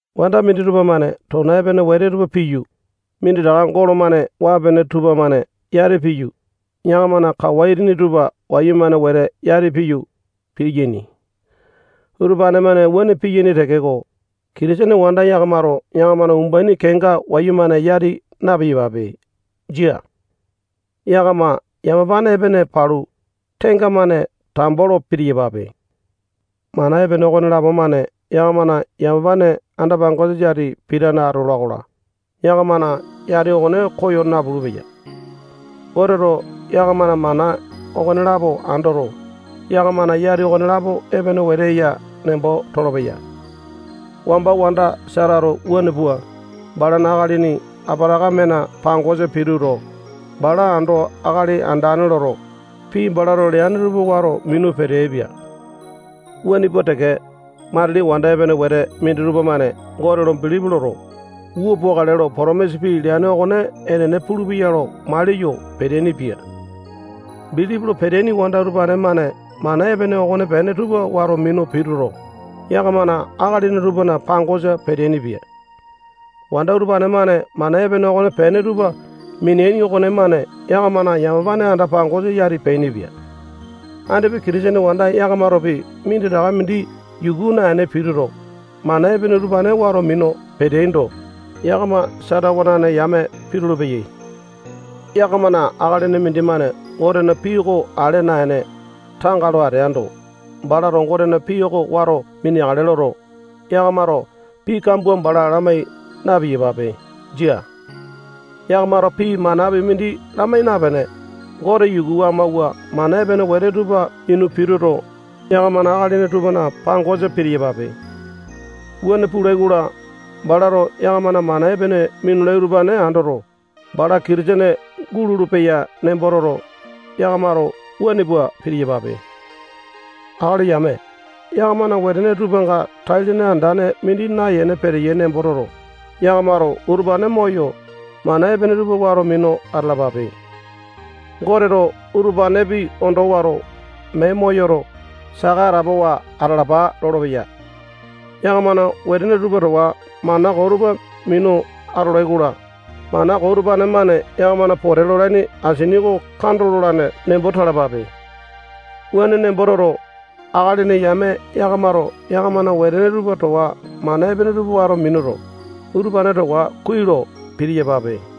Wanda minditupa-mane tona epene wete tupa piyu, minditaka golo-mane waa-pene tupamane yati piyu, yakamana kawa itini tupa wayumane wete yati piyu, piyaini. Utupane-mane wuane piyaini tekeko, Kitisene wanda yakamato yakamana umbaini kenga wayumane yati na-piyapape. Jia. Yakama yamapane epene palu, tenga-mane tambo lo pitiyapape. Mana epene okonelapo-mane yakamana yamapane anda-pangosa yati pitane atola-kola, yakamana yati okone koyo napulu-peya. Goteto yakamana mana okonelapo andoto, yakamana yati okonelapo epene wete eya nembo tolopeya. Wamba wanda Satato wuane pua, balana akalini Apatakamena pangosa pituto, bala ando akali andane loto, pii balato leane tupa wato minu peteaipia. Wuane pua teke, matili wanda epene wete minditupa-mane Gote lo bilipi loto, wua pukale lo potomisa pii leane okone enene pulupeya lo maliyo peteaini-pia. Bilipi lo peteaini wanda utupane-mane mana epene okonepene tupa wato minu pituto, yakamana akalini tupana pangosa peteaini-pia. Wanda utupane-mane mana epene okonepene tupa mineaini okonemane yakamana yamapane anda-pangosa yati peainipia. Andipa Kitisene wanda yakamatopi minditaka mindi yuku naene pituto, mana epene utupane wato minu peteaindo, yakama Sata wanane yame pitulu-peyai. Yakamana akalini mindimane Gotena pii oko ale naene, tanga lo ateando, balato Gotena pii oko wato mineakale loto, yakamato pii kambua bala lamai na-piyapape. Jia. Yakamato pii manapi mindi lamai napene, Gote yuku amawua mana epene wete tupa minu pituto, yakamana akalini tupana pangosa pitiyapape. Wuane pulai-kola, balato yakamana mana epene minulai utupane andoto, bala Kitisene gulolo-peya nembo toto, yakamato wuane pua pitiyapape Akali yame, yakamana wetene tupanga tai-lene andane mindi nayene peteyai nembo toto, yakamato utupane moyo, mana epene tupa wato minu atalapape. Goteto utupanepi ondo wato, mee moyoto, saka atapowa atalapa lolopeya. Yakamana wetene tupa towa mana koo tupa minu atolai-kola, mana koo utupane-mane yakamana pote lolaini asini oko kando lolane nembo talapape. Wuane nembo toto, akalini yame yakamato yakamana wetene tupa towa mana epene tupa wato minuto, utupane towa kuai lo pitiyapape.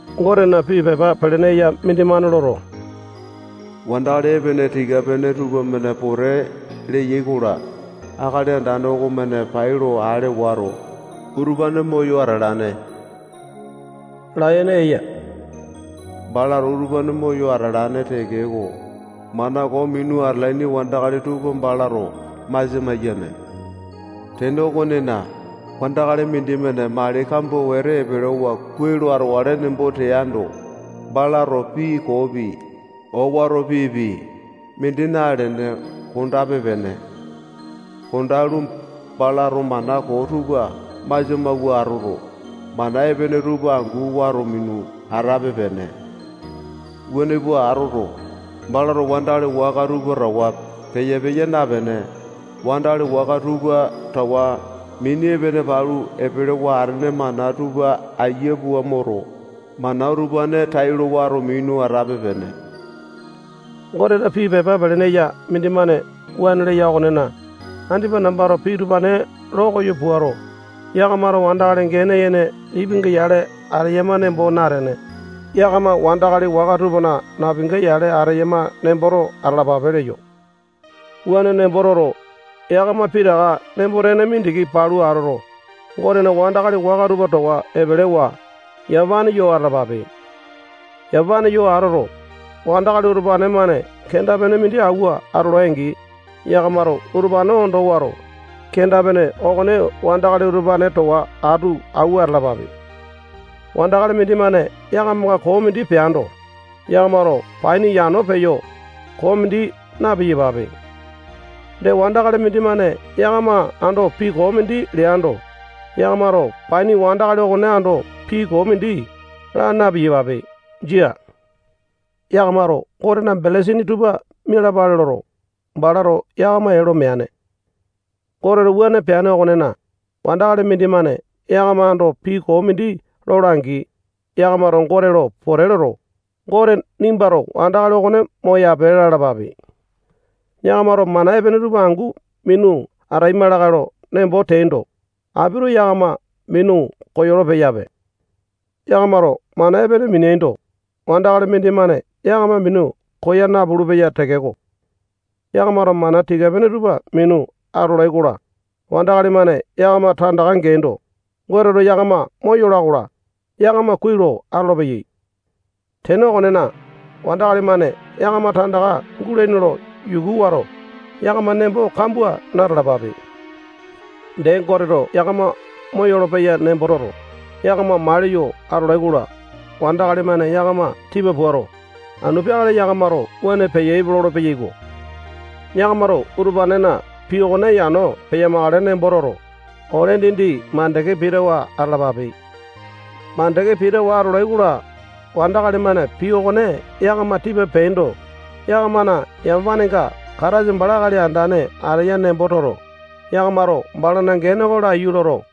Gotena pii pepa pelene eya mindimane loto, wandakali epene tika-pene tupamane pote leyai-kola, Akali Andane okomane pailo ale wato, utupane moyo atalane layene eya. Balato utupane moyo atalane tekeko, mana koo minu atalaini wandakali tupa balato masia maiyane. Tene okonena, wandakali mindimane mali kambua wete epelewa kuai lo atokale nembo teando, balato pii koopi, owato piipi, mindi nalene kondape-pene. Kondalu, balato mana koo tupa masia mawua atoto, mana epene tupa angu wato minu atape-pene. Wuane pua atoto, balato wandakali waka tupa towa peya-peya napene, wandakali waka tupa towa mini epene palu epelewa atene mana tupa aiya pua moto, mana utupane tailo wato minu atape-pene. Gotena pii pepa pelene eya mindimane wuane leya okonena, andipa nambato pii utupane lo koyo puato, yakamato wandakali gene yene lipinga yale ateyama nembo natene, yakama wandakali waka napinga yale ateyama nemboto atalapape leyo. Wuane nembo toto, yakama pitaka nembo-tene mindiki palu atoto, Gotena wandakali waka tupa towa epelewa, yamapane yo atalapape. Yamapane yo atoto, wandakali utupane-mane kenda-pene mindi awua atolai-angi, yakamato utupane ondo wato, kenda-pene okone wandakali utupane towa atu awua atalapape. Wandakali mindimane yakamanga koo mindi peando, yakamato paini yano peyo, koo mindi na-piyapape. Dee, wandakali mindimane yakama ando pii koo mindi leando, yakamato paini wandakali okone ando pii koo mindi laa na-piyapape. Jia. Yakamato Gotena belesini tupa mialapale loto, balato yakama ee lo meane. Goteto wuane peane okonena, wandakali mindimane yakama ando pii koo mindi lola-angi, yakamato Gote lo pote loto, Gote nimbato wandakali okone moyape lalapape. Yakamato mana epene tupa angu minu ataima lakae lo nembo teaindo, apito yakama minu koyolo-peyape. Yakamato mana epene mineaindo, wandakali mindimane yakama minu koya napulu-peya tekeko, yakamato mana tika-pene tupa minu atolai-kola, wandakali-mane yakama tandaka geaindo, Goteto yakama moyola-kola, yakama kuai lo atolopeyai. Tene okonena, wandakali-mane yakama tandaka gulaini lo yuku wato, yakama nembo kambua na-talapape. Dee, Goteto yakama moyolo-peyai nembo toto, yakama maliyo atolai-kola, wandakali-mane yakama tipa puato, anu peakale yakamato wuane peyaipe lolo-peyaiko. Yakamato utupanena pii okone yano peyamakale nembo toto, ole dindi mandeke pitawa atalapape. Mandeke pitawa atolai-kola, wandakali-mane pii okone yakama tipa peaindo, yakamana yamapanenga Kataisa bala Akali Andane ateya nembo toto, yakamato balana gene oko laiyu loto,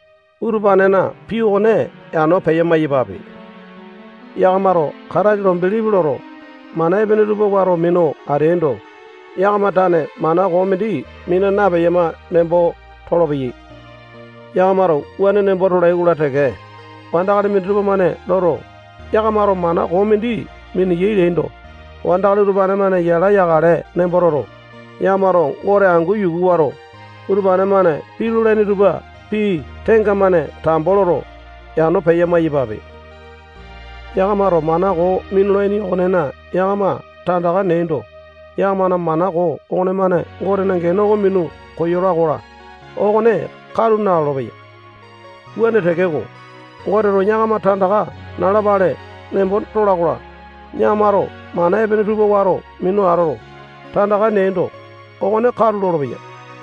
utupanena pii okone yano peya-maiyapape. Yakamato Kataisa lo bilipi loto, mana epene tupa wato minu ateaindo, yakama tane mana koo mindi mina napeyama nembo tolopeyai. Yakamato wuane nembo tolai-kola teke, wandakali minditupa-mane loto, yakamato mana koo mindi miniyai leaindo, wandakali utupane-mane yala yakale nembo toto, yakamato Gote angu yuku wato, utupane-mane pii lolaini tupa pii tenga-mane tambo loto, yano peya-maiyapepe. Yakamato mana koo minulaini okonena yakama tandaka neaindo, yakamana mana koo okonemane Gotena gene oko minu koyola-kola, okone katu nalolo-peya. Wuane tekeko, Goteto yakama tandaka nalapale nembo tola-kola, yakamato mana epene tupa wato minu atoto, tandaka neaindo, okone katu lolopeya.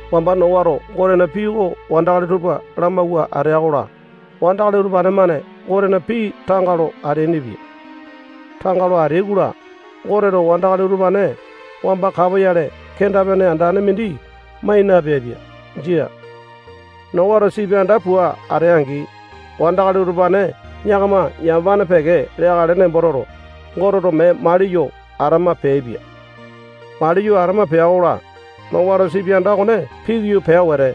Wamba Nowato Gotena pii oko wandakali tupa lamawua atea-kola, wandakali utupane-mane Gotena pii tanga lo ateainipia. Tanga lo ateai-kola, Goteto wandakali utupane wamba kapoyale kenda-pene andane mindi mai napeaipia. Jia. Nowato sipi anda pua atea-angi, Wandakali utupane yakama yamapane peke leakale nembo toto, Goteto mee maliyo atama peaipia. Maliyo atama pea-kola, Nowato sipi anda okone pikoyo pea wete,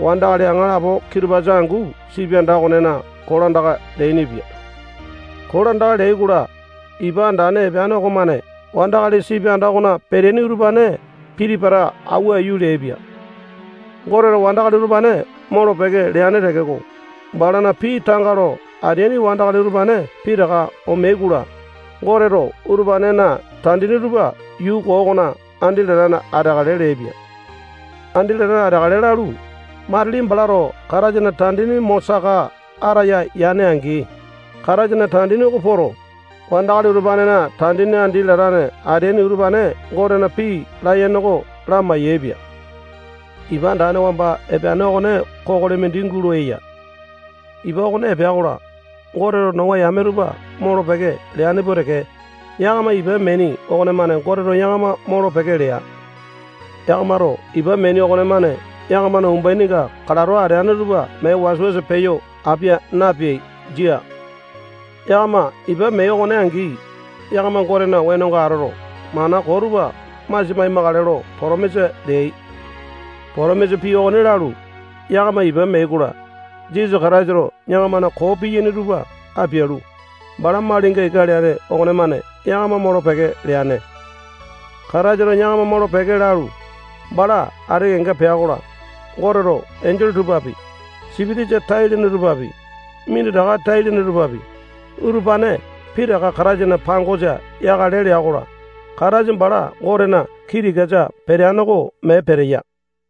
wandakali aŋalapo kitupasa angu sipi anda okonena kolandaka leainipia. Kolandaka leai-kola, ipa andane epeane okomane wandakali sipi anda okona peteaini utupane piti-pata awua aiyu leaipia. Goteto wandakali utupane molo-peke leane tekeko, balana pii tanga lo ateaini wandakali utupane pitaka omeai-kola, Goteto utupanena tandini tupa yuu koo okona andi latane ateakale leaipia. Andi latane ateakale lalu, matili balato Kataisana tandini mo saka ataya yane-angi, Kataisana tandini oko poto, wandakali utupanena tandini andi latane ateaini utupane Gotena pii layene oko lamai-yaepia. Ipa andane wamba epeane okone kokoli mindi eya. Ipa okone epea-kola, Goteto Nowa yame tupa molo-peke leane pua teke, yakama ipa meaini okonemane Goteto yakama molo-peke lea. Yakamato ipa meaini okonemane yakamana umbaininga kalato ateane tupa mee wasa-wasa peyo apia napeai. Jia. Yakama ipa meai okone angi, yakama Gotena wenonga atoto, mana koo tupa masia mai-makale lo potomisa leai. Potomisa pii okone lalu, yakama ipa meai-kola, Jisasa Kataisato yakamana koo piyaini tupa apialu, bala malinga ika leane okonemane yakama molo-peke leane. Kataisato yakama molo-peke lalu, bala ati kenga pea-kola, Goteto enjole tupapi, sipitisa tai-lene tupapi, minditaka tai-lene tupapi, utupane pitaka Kataisana pangosa yakale lea-kola, Kataisa bala Gotena kii tikasa peteane oko mee peteya.